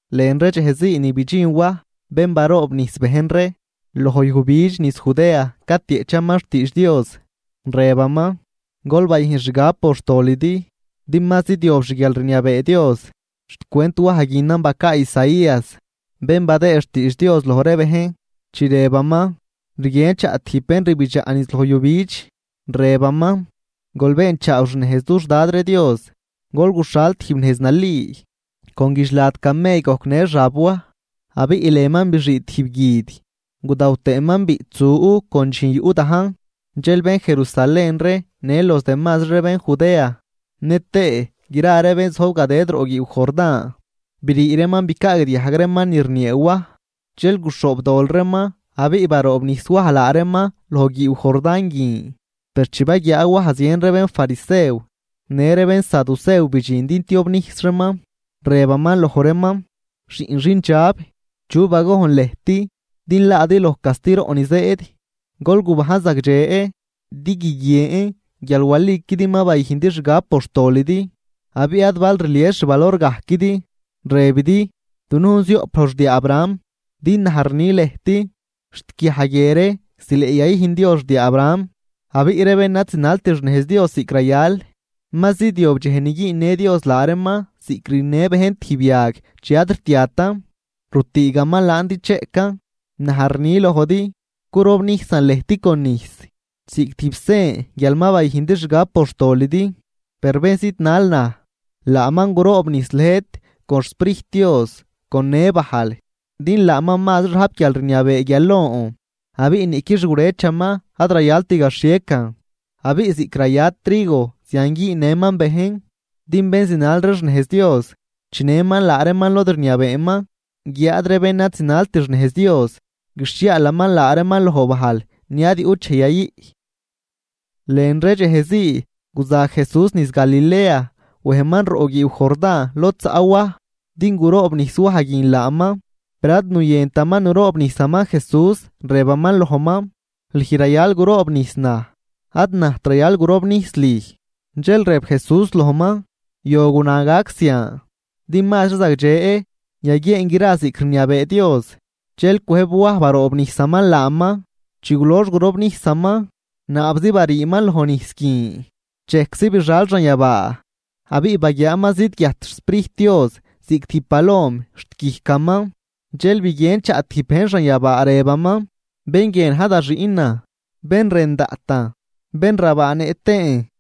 Lën ree dxej ni bidxin Waj, bén baroobnijs bejn ree, loj yujbidx niz Judea catieꞌchaman xtiidx Dios. Rëbaman: ―Gol bayüjn xgab por xtolidi din ma zidyob xguialrniabee Dios. Xcwent Waj guinan bacaa Isaías, bén badëë xtiidx Dios loj ree bejn, chi rëbaman: Rguien chaꞌ tijb bén rbidxaꞌ niz loj yujbidx, rëbaman: “Gol beenchaaw xnejz dux Dad ree Dios, gol guxhal tijb nejz nali.” Con guidxlad camell gojcnë xab Waj, abiꞌ lënman bixii tijb guid. Gudaw tëëman biꞌtsu con dxijn yuꞌ dajn. Dxel bén Jerusalén ree në los demazri ree bén Judea nëtëë gra ree bén zojb gadëd roꞌ guiiw Jordán, brii reeman bicaagdiajg reeman ni rniee Waj. Dxel guxhoobdol reeman, abiꞌ baroobnijs Waj laa reeman loj guiiw Jordán guin. Per chi baguiaa Waj zien ree bénfarisew në ree bénsaducew bidxin din tiobnijs reeman, rëbaman loj reeman: ―¡Xiꞌn xindxab! ¿Chu bagojn lëjt din laadi loj castiroꞌ ni zëëd? Gol gubajn zagdxe din guiguien guial waliquidi ma bayüjndi xgab por xtolidi, abiꞌ ad bal rlies xvalorgajquidi, rëbidi: “Dunujn zioꞌp loj xdiaa Abraham”, din naj rni lëjt xt guiaj guie ree zileꞌ yayüjn Dios xdiaa Abraham. Abiꞌ ree bén ad zinalt xnejz Dios ziꞌc rayal, ma zidyob dxej ni güünnë Dios laa reeman ziꞌc rüjnnë bejn tijb yag chi ad rtiatan, rutüügaman laan din cheꞌcan. Naj rni lojdi, curobnijsan lëjt con nijs ziꞌc tijb sen guial ma bayüjndi xgab por xtolidi. Per bén zidnal naj, laaman guroobnijs lëjt con xSprijt Dios con në bajl, din laaman mazri rajp guialrniabee guial lon, abiꞌ niꞌqui xgurëchaman ad rayalt gaxhiecan. Abiꞌ ziꞌc raya trigo zian güünnëman bejn. Din bén zinal ree xnejz Dios chinëman laa reeman lod rniabeeman, guiáad ree bén ad zinalt xnejz Dios guixhiaalaman laa reeman loj bajl ni ad yuꞌt dxej yayüꞌ. Lën ree dxej zii guza Jesús niz Galilea wejman roꞌ guiiw Jordán lod zaꞌ Waj, din guroobnijs Waj guin laaman. Per ad nuyëntaman nuroobnijsaman Jesús, rëbaman lojman: ―Lüj rayal guroobnijs naj, ad najt rayal gurobnijs lüj. Dxel rëb Jesús lojman: ―Yo guna gac zian, din mazri zagdxe yaguieen gra ziꞌc rniabee Dios. Dxel cwëjb Waj baroobnijsaman laaman. Chi gulox gurobnijsaman, naabzi bariiman loj nijs guin, dxejczi bixal xanyabaa, abiꞌ baguiaaman zidguiajt xSprijt Dios ziꞌc tijb palom xt guijcaman. Dxel biguien chaꞌ tijb bejn xanyabaa, rëbaman: ―Bén guie na̱j da Xiꞌnan, bén rën daꞌtan bén rabaanëꞌ tëën.